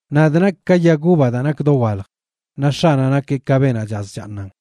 ’Nadꞌ nakꞌ ka yag uva daa nak dowalj, naꞌ X̱aꞌnaꞌ nakeꞌ ka beenaꞌ chaz chaaṉan.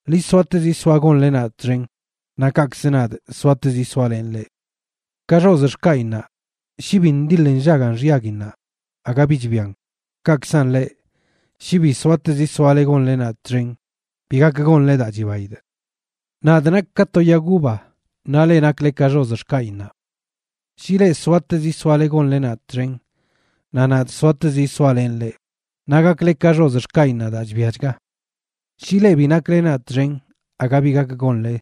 Ḻi soatezi soa gonle nadꞌ txen, naꞌ kaꞌkz nadꞌ soatezi soalenꞌ leꞌ. Ka xozꞌ xkaꞌinnaꞌ, shi bi ndiḻ nllagan xyaguinnaꞌ aga bi chbian, kaꞌkzan leꞌ shi bi soatezi soale gonle nadꞌ txen bi gak gonle daa chibaidꞌ. ’Nadꞌ nakꞌ ka to yag uva, naꞌ leꞌ nakle ka xozꞌ xkaꞌinnaꞌ. Shi leꞌ soatezi soale gonle nadꞌ txen naꞌ nadꞌ soatezi soalenꞌ leꞌ, naꞌ gakle ka xozꞌ xkaꞌinnaꞌ daa chbiachga. Shi leꞌ bi nakle nadꞌ txen aga bi gak gonle.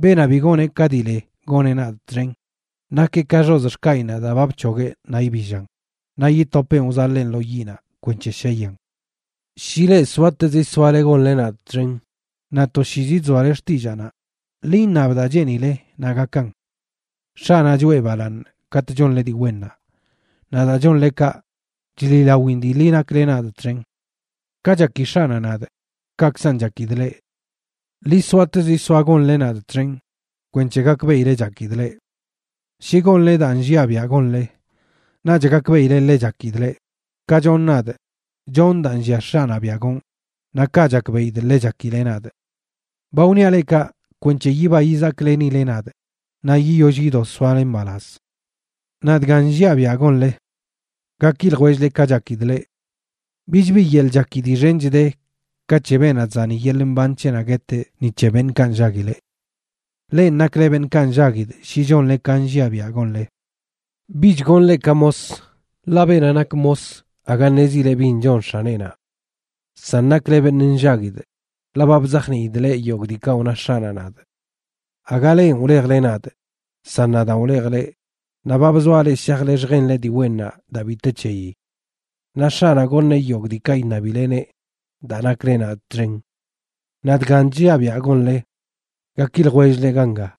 Beenaꞌ bi goneꞌ ka dii le goneꞌ nadꞌ txen, nakeꞌ ka xozꞌ xkaꞌinnaꞌ daa ba bc̱hogueꞌ naꞌ ibillan, naꞌ yitopeꞌn wzaḻeen lo yiꞌnaꞌ kwenc̱he sheyan. ’Shi leꞌ soatezi soale gonle nadꞌ txen naꞌ toshiizi chzoale xtillaanaꞌ, ḻi iṉab daa cheenile naꞌ gakan. X̱aꞌnaꞌ choꞌe balaaṉ katꞌ chonle dii wennaꞌ, naꞌ daa chonle kaꞌ, chliꞌlawin dii ḻi nakle nadꞌ txen. Ka chaki X̱aꞌnaꞌ nadꞌ, kaꞌkzan chakidꞌ leꞌ. Ḻi soatezi soa gonle nadꞌ txen kwenc̱he gakbeꞌile chakidꞌ leꞌ. Shi gonle daa nlliaꞌ biaꞌ gonle, naꞌch gakbeꞌile ḻe chakidꞌ leꞌ, ka chonꞌ nadꞌ, chonꞌ daa nllia X̱aꞌnaꞌ biaꞌ gonꞌ, naꞌ kaꞌ chakbeꞌidꞌ ḻe chakileꞌ nadꞌ. ’Ba wniaꞌ leꞌ kaꞌ kwenc̱he yiba yizaklenileꞌ nadꞌ, naꞌ yiyoll yido soale mbalaz. Naꞌ dgan nlliaꞌ biaꞌ gonle: Gaki ljwell-le ka chakidꞌ leꞌ. Bich bi yeḻꞌ chaki dii xench de ka c̱he beenaꞌ chzani yeḻꞌ mban c̱heꞌnaꞌ gueteꞌ ni c̱he beṉꞌkaꞌ nllaguileꞌ. Lenꞌ nakle beṉꞌkaꞌ nllaguidꞌ shi chonle ka nlliaꞌ biaꞌ gonle. Bich gonꞌ leꞌ ka mos, ḻaꞌ beenaꞌ nak mos aga ṉezileꞌ bin chon x̱aneꞌnaꞌ. San nakle beṉꞌ nllaguidꞌ ḻaꞌ ba bzajniidꞌ leꞌ yogꞌ diikaꞌ wna X̱aꞌnaꞌ nadꞌ. Aga lenꞌ wlejle nadꞌ, san nadaan wlejꞌ leꞌ naꞌ ba bzoaꞌ leꞌ shajle lljenle dii wennaꞌ daa bi te c̱heyi. Naꞌ X̱aꞌnaꞌ goṉeꞌ yogꞌ daa iṉabileneꞌ daa nakle nadꞌ txen. Naꞌ dgan chlliaꞌ biaꞌ gonle: Gaki ljwell-le ganga.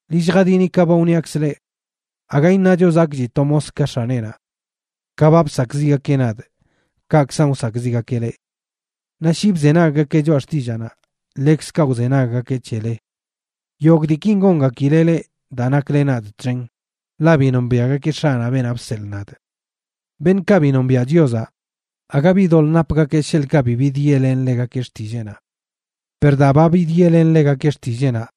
Ḻi lljadini ka ba wniakzꞌ leꞌ: “Aga iṉacho zakꞌchi to mos ka x̱aneꞌnaꞌ.” Ka ba bsakꞌziꞌgakeꞌ nadꞌ, kaꞌkzan wsakꞌziꞌgakeꞌ leꞌ. Naꞌ shi bzenaggakeꞌ choꞌa xtillaanaꞌ, ḻekzkaꞌ wzenaggakeꞌ c̱hele. Yogꞌ diikin gongakileꞌ leꞌ daa nakle nadꞌ txen, ḻaꞌ bi nombiaꞌgakeꞌ X̱aꞌnaꞌ beenaꞌ bseḻꞌ nadꞌ. ’Beṉꞌkaꞌ bi nombiaꞌ Chiozaꞌ, aga bi doḻꞌ napgakeꞌ sheḻꞌkaꞌ bi bidyeꞌlenꞌ ḻegakeꞌ xtilleenaꞌ. Per daa ba bidyeꞌlenꞌ ḻegakeꞌ xtilleenaꞌ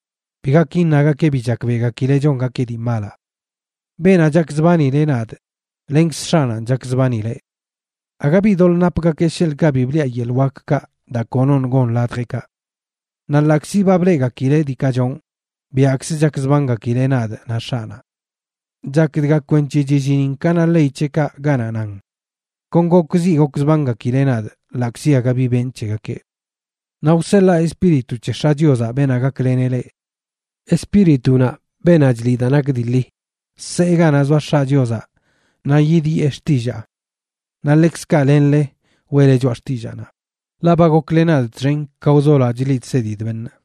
bi gak iṉagakeꞌ bi chakbeꞌgakileꞌ chongakeꞌ dii malaꞌ. Beenaꞌ chakzbanileꞌ nadꞌ lenkz X̱aꞌnanꞌ chakzbanileꞌ. Aga bi doḻꞌ napgakeꞌ sheḻꞌkaꞌ bi bliꞌa yeḻꞌ wakkaꞌ daa konoṉꞌ gon ladjeꞌkaꞌ. Naꞌ ḻaꞌkzi ba bleꞌgakileꞌ diikaꞌ chonꞌ, biaꞌkzə chakzbangakileꞌ nadꞌ naꞌ X̱aꞌnaꞌ. Chak dga kwenc̱he chillinin ka na ley c̱heꞌkaꞌ ganaꞌ nan: “Kon gokziꞌ gokzbangakileꞌ nadꞌ ḻaꞌkzi aga bi benꞌ c̱hegakeꞌ.” ’Naꞌ wseḻaa Espíritu c̱he X̱aꞌ Chiozaꞌ, beenaꞌ gakleneꞌ leꞌ. Espíritunaꞌ, beenaꞌ chliꞌ daa nak dii ḻi, see ganaꞌ zoa X̱aꞌ Chiozaꞌ naꞌ yidyee xtillaa. Naꞌ ḻekzkaꞌ lenle weꞌle choꞌa xtillaanaꞌ, ḻaꞌ ba gokle nadꞌ txen ka wzoloaꞌ chliꞌ chsedidꞌ beṉꞌ.